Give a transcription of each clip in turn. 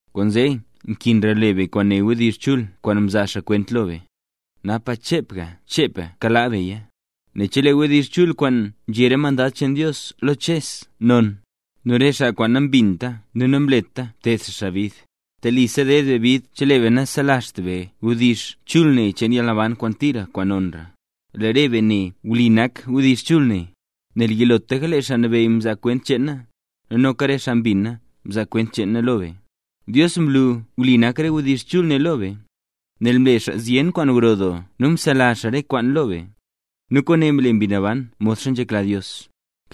Kwaanzee nkinra le be kwaan né wdizh chul kwaan mzaa xaa kwent lo be, napa chepga chepga kalaa beya. Nel chelee wdizh kwaan nzhé re mandad cheen Dios lo Ches non, nu re xaa kwaan nambinta nu namleta mted xaa xaa bid, telisa ded be bid chelee be naselazht be wdizh chul ne cheen yalnaban kwaan tira, kwaan nonra. Lee re be ne, wli nak wdizh chul ne, nel yilotlaka lee Xaa Nabeyy mzaa kwent cheena, nu noka re xaa mbina mzaa kwent cheena lo be. Dios mlu wli nak re wdizh chul ne lo be, nel mle xaa zyen kwaan gro doo nu mzelazh xaa re kwaan lo be, nu kwaane mle Mbi Naban modxa nzhekla Dios.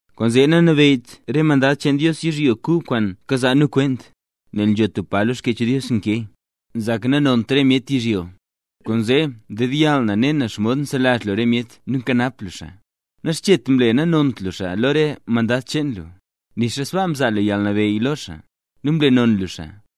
Kwaanzee nanabeyyt re mandad cheen Dios yizhyo kub kwaan kazaa nu kwent. Nel nzho tub pa lo Xkyech Dios nkee: Nzak na nanont re myet yizhyo, kwaanzee ndedyall na ne na xomod nselazh lu re myet nu nkanap lu xaa. Naxchet mle nanont lu xaa lo re mandad cheen lu, nixa sbaa mzaa lu yalnabeyy lo xaa, nu mle non lu xaa;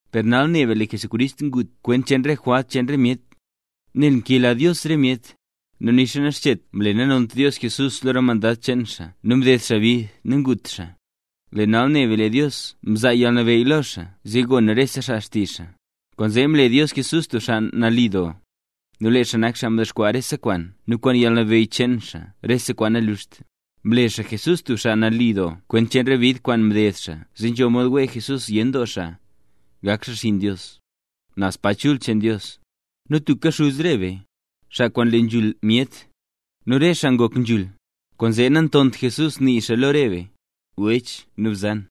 Per nal ne be lee Jesús ngut kwent cheen re jwalt cheen re myet, nel nkela Dios re myet. Nu nixa naxchet mle nanont Dios Jesús lo re mandad cheen xaa nu mded xaa bid nu ngut xaa, lee nal ne be lee Dios mzaa yalnabeyy lo xaa zee gon rese xaa xtizh xaa. Kwaanzee mle Dios Jesús tub xaa nali doo, nu lee xaa nak xaa mdexkwaa rese kwaan nu kwaan yalnabeyy cheen xaa rese kwaan nanluxt. Mle xaa Jesús tub xaa nali doo kwent cheen re bid kwaan mded xaa zee nzho mod wee Jesús zyen doo xaa, gak xaa xinn Dios, naz pa chul cheen Dios. Nu tubka Xuz re be, xaa kwaan nle nzhul myet, nu re xaa ngok nzhul. Kwaanzee nantont Jesús nii xaa lo re be: “wech” nu “bzan”,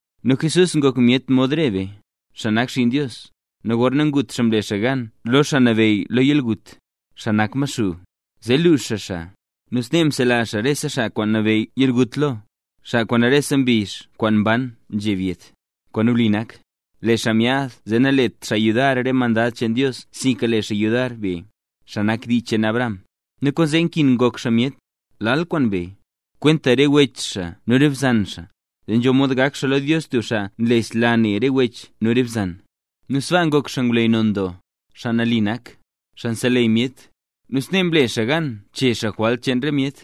Nu Jesús ngok myet mod re be, xaa nak xinn Dios, nu gorna ngut xaa mle xaa gan lo xaa nabeyy lo yalgut, xaa nak Maxuu, zee luux xaa xaa. Nu snee msela xaa re xaa kwaan nabeyy yalgut lo, xaa kwaan rese mbizh kwaan mban, nzheb yet. Kwaan wli nak: Lee xaa myaad zee nalet xaa yudar re mandad cheen Dios sinka le xaa yudar be, xaa nak dii cheen Abraham. Nu kwaanzee nkin ngok xaa myet, lal kwaan be, kwenta re wech xaa nu re bzan xaa, zee nzho mod gak xaa lo Dios tub xaa nlesla ne re wech nu re bzan; nu sbaa ngok xaa ngwleyy non doo, xaa nali nak, xaa nseleyy myet, nu snee mle xaa gan chee xaa jwalt cheen re myet.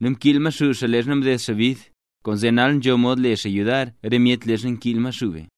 Nu mkiil Maxuu xaa leezha mded xaa bid, kwaanzee nal nzho mod le xaa yudar re myet leezha nkiil Maxuu be.